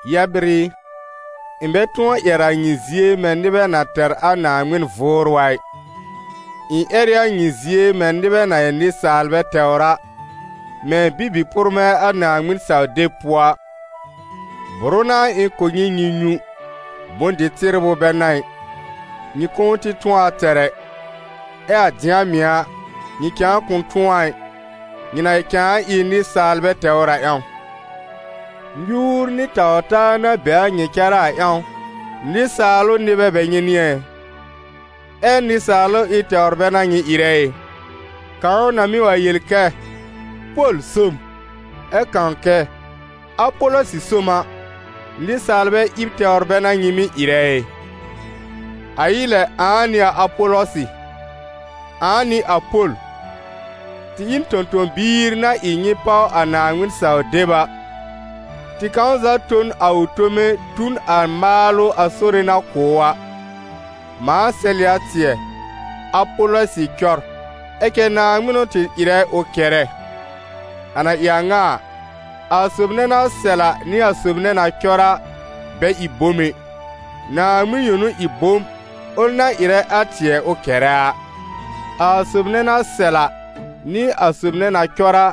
Yɛbr ɩ, ɩ̃ bɛ tʋ̃ɔ ƴɛr a nyɩ zie mɛ̃ nɩbɛ na tɛr a Naaŋmɩn Vʋʋrʋ a ɩ; ɩ̃ ƴɛr ɩ a nyɩ zie mɛ̃ nɩbɛ na ɩ nɩsaalbɛ tɛwr a, mɛ̃ bibi-pʋrmɛ̃ a Naaŋmɩn-saw-deb pʋɔ a. Bʋrʋ n'a ɩ̃ kʋ̀ nyɩ nyɩ nyũ, bʋ̃-dɩ-tɩbrʋ bɛ n'a ɩ: nyɩ kʋ̃ʋ tɩ tʋ̃ɔ a tɛr ɛ. Ɛ a dɩ̃a mɩ̀ a, nyɩ cãa kʋ̃ tʋ̃ɔ a ɩ, nyɩ na cãa ɩ nɩsaalbɛ tɛwr a ƴãw. Nyuur nɩ taw-taa na be a nyɩ cárá a ƴãw, nɩsaalʋ nɩbɛ bɛ n'ɩ nyɩ ɛ? Ɛ nɩsaalʋ ɩb tɛwr bɛ n'a nyɩ ɩrɛ ɩ? Kãw na mɩ́ wa yel kɛ: «Pol so m», ɛ kãw kɛ: «Apɔlɔsɩ so m» a, nɩsaalbɛ ɩb tɛwr bɛ n'a nyɩ mɩ́ ɩrɛ ɩ? A ɩ lɛ ãa n'ɩ a Apɔlɔsɩ? Ãa n'ɩ a Pol? Tɩ ɩ n tõ-tõ-biir na ɩ nyɩ páw a Naaŋmɩn-saw-deb a; tɩ kãw za tõ n a ʋ tome tu n a maalʋ a Sore na kʋ̀ ʋ a. Mãa sɛl ɩ a tɩɛ, Apɔlɔsɩ cɔr, ɛ cɛ Naaŋmɩn n'ʋ tɩ ɩrɛ ʋ kɛrɛ. A na ɩ a ŋa a, a sob nɛ na sɛl a nɩ a sob nɛ na cɔr a, bɛ ɩ bom ɛ, Naaŋmɩn yõ n'ʋ ɩ bom, ʋl na ɩrɛ a tɩɛ ʋ kɛrɛ a. A sob nɛ na sɛl a, nɩ a sob nɛ na cɔr a,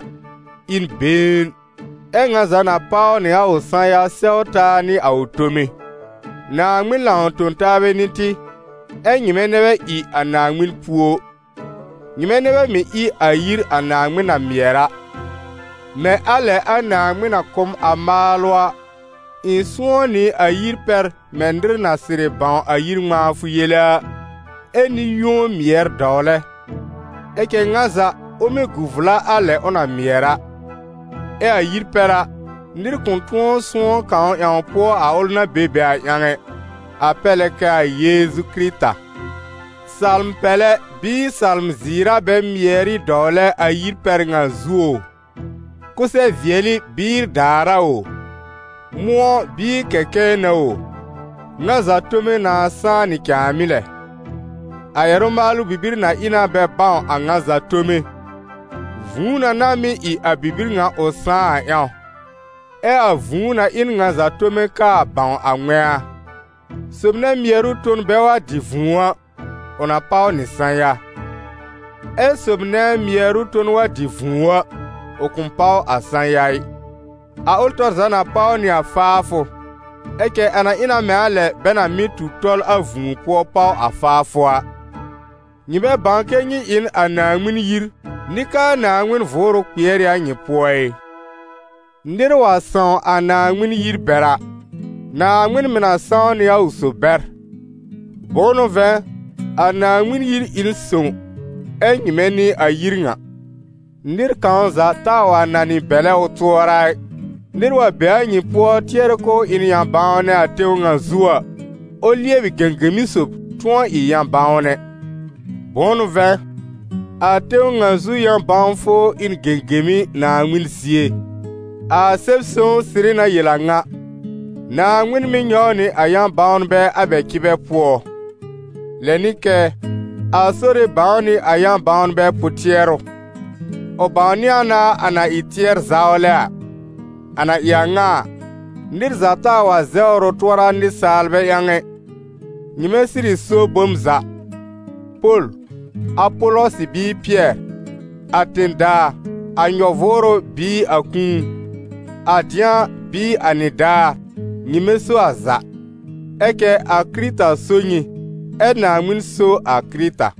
ɩ n been, ɛ́ ŋa za na páw nɩ a ʋ sã-ya sɛw taa nɩ a ʋ tome. Naaŋmɩn lãw-tõ-taabɛ n'ɩ tɩ, ɛ́ nyɩmɛ nɛ bɛ ɩ a Naaŋmɩn púo. Nyɩmɛ nɛ bɛ mɩ̀ ɩ a yir a Naaŋmɩn na mɩɛr a. Mɛ̃ a lɛ a Naaŋmɩn na kʋ̀ m a maalʋ a, ɩ̃ sʋ̃ɔ́ nɩ a yir pɛr mɛ̃ nɩr na sɩrɩ bãw a yir ŋmãafʋ yele a, ɛ nɩ-yũo mɩɛr dɔwlɛ. Ɛ cɛ ŋa za, ʋ mɩ́ gu vla a lɛ ʋ na mɩɛr a. Ɛ a yir pɛr a, nɩr kʋ̃ tʋ̃ɔ sʋ̃ɔ́ kãw ƴãw pʋɔ a ʋl na be be a ƴãw ɛ: a pɛr lɛ kɛ a Yeezu Kɩrɩta. Salm-pɛlɛ bɩɩ salm-zɩɩr a bɛ mɩɛr ɩ dɔwlɛ a yir pɛr ŋa zuo o, kʋsɛ-vɩɛlɩ bɩɩ daar a o, mʋ̃ɔ bɩɩ kɛkɛɛ n'a o, ŋa za tome nãa sãá nɩ cãàmɩ́ lɛ. A ƴɛrʋ-maalʋ bibir na ɩ na bɛ bãw a ŋa za tome, vũu na n'a mɩ́ ɩ a bibir ŋa ʋ sãá a ƴãw, ɛ a vũu na ɩ n ŋa za tome kaa bãw a ŋmɛ̃a. Sob nɛ mɩɛrʋ ton bɛ wa dɩ vũu a, ʋ na páw nɩ sã-ya. Ɛ sob nɛ mɩɛrʋ ton wa dɩ vũu a, ʋ kʋ̃ páw sã-ya ɩ; a ʋl tɔr za na páw nɩ a faafʋ, ɛ cɛ a na ɩ na mɛ̃ a lɛ bɛ na mɩ́ tu tɔl a vũu pʋɔ páw a faafʋ a. Nyɩ bɛ bãw kɛ nyɩ ɩ n a Naaŋmɩn yir, nɩ k'aa Naaŋmɩn Vʋʋrʋ kpɩɛr ɩ a nyɩ pʋɔ ɩ? Nɩr wa sãw a Naaŋmɩn yir bɛr a, Naaŋmɩn mɩ̀ na sãw nɩ a ʋ sob bɛr. Bʋ̃ʋ n'ʋ vɛ̃, a Naaŋmɩn yir ɩ n sõw, ɛ nyɩmɛ n'ɩ a yir ŋa. Nɩr kãw za taa wa nanɩ bɛ̀lɛ ʋ tʋɔra ɩ: nɩr wa be a nyɩ pʋɔ tɩɛrɛ k'ʋʋ ɩ n yã-bãwnɛ a tẽw ŋa zu a, ʋ lɩɛbɩ gẽgemi sob, tʋ̃ɔ ɩ yã-bãwnɛ; bʋ̃ʋ n'ʋ vɛ̃, a tẽw ŋa zu yã-bãwfʋ ɩ n gẽgemi Naaŋmɩn zie. A Sɛb-sõw sɩrɩ na yel a ŋa: «Naaŋmɩn mɩ́ nyɔw nɩ a yã-bãwnbɛ a bɛ cɩbɛ pʋɔ»; lɛ nɩ kɛ: «A Sore bãw nɩ a yã-bãwnbɛ pʋ-tɩɛrʋ, ʋ bãwnɩ a na a na ɩ tɩɛr-zawlɛ a.» A na ɩ a ŋa a, nɩr za taa wa zɛwr ʋ tʋɔra nɩsaalbɛ ƴãw ɛ; nyɩmɛ sɩrɩ so bom za: Pol, Apɔlɔsɩ bɩɩ Pɩɛr, a tẽ-daa, a nyɔ-vʋʋrʋ bɩɩ a kũu, a dɩ̃a bɩɩ a nɩdaar, nyɩmɛ so a za; ɛ cɛ a Kɩrɩta so nyɩ, ɛ Naaŋmɩn so a Kɩrɩta.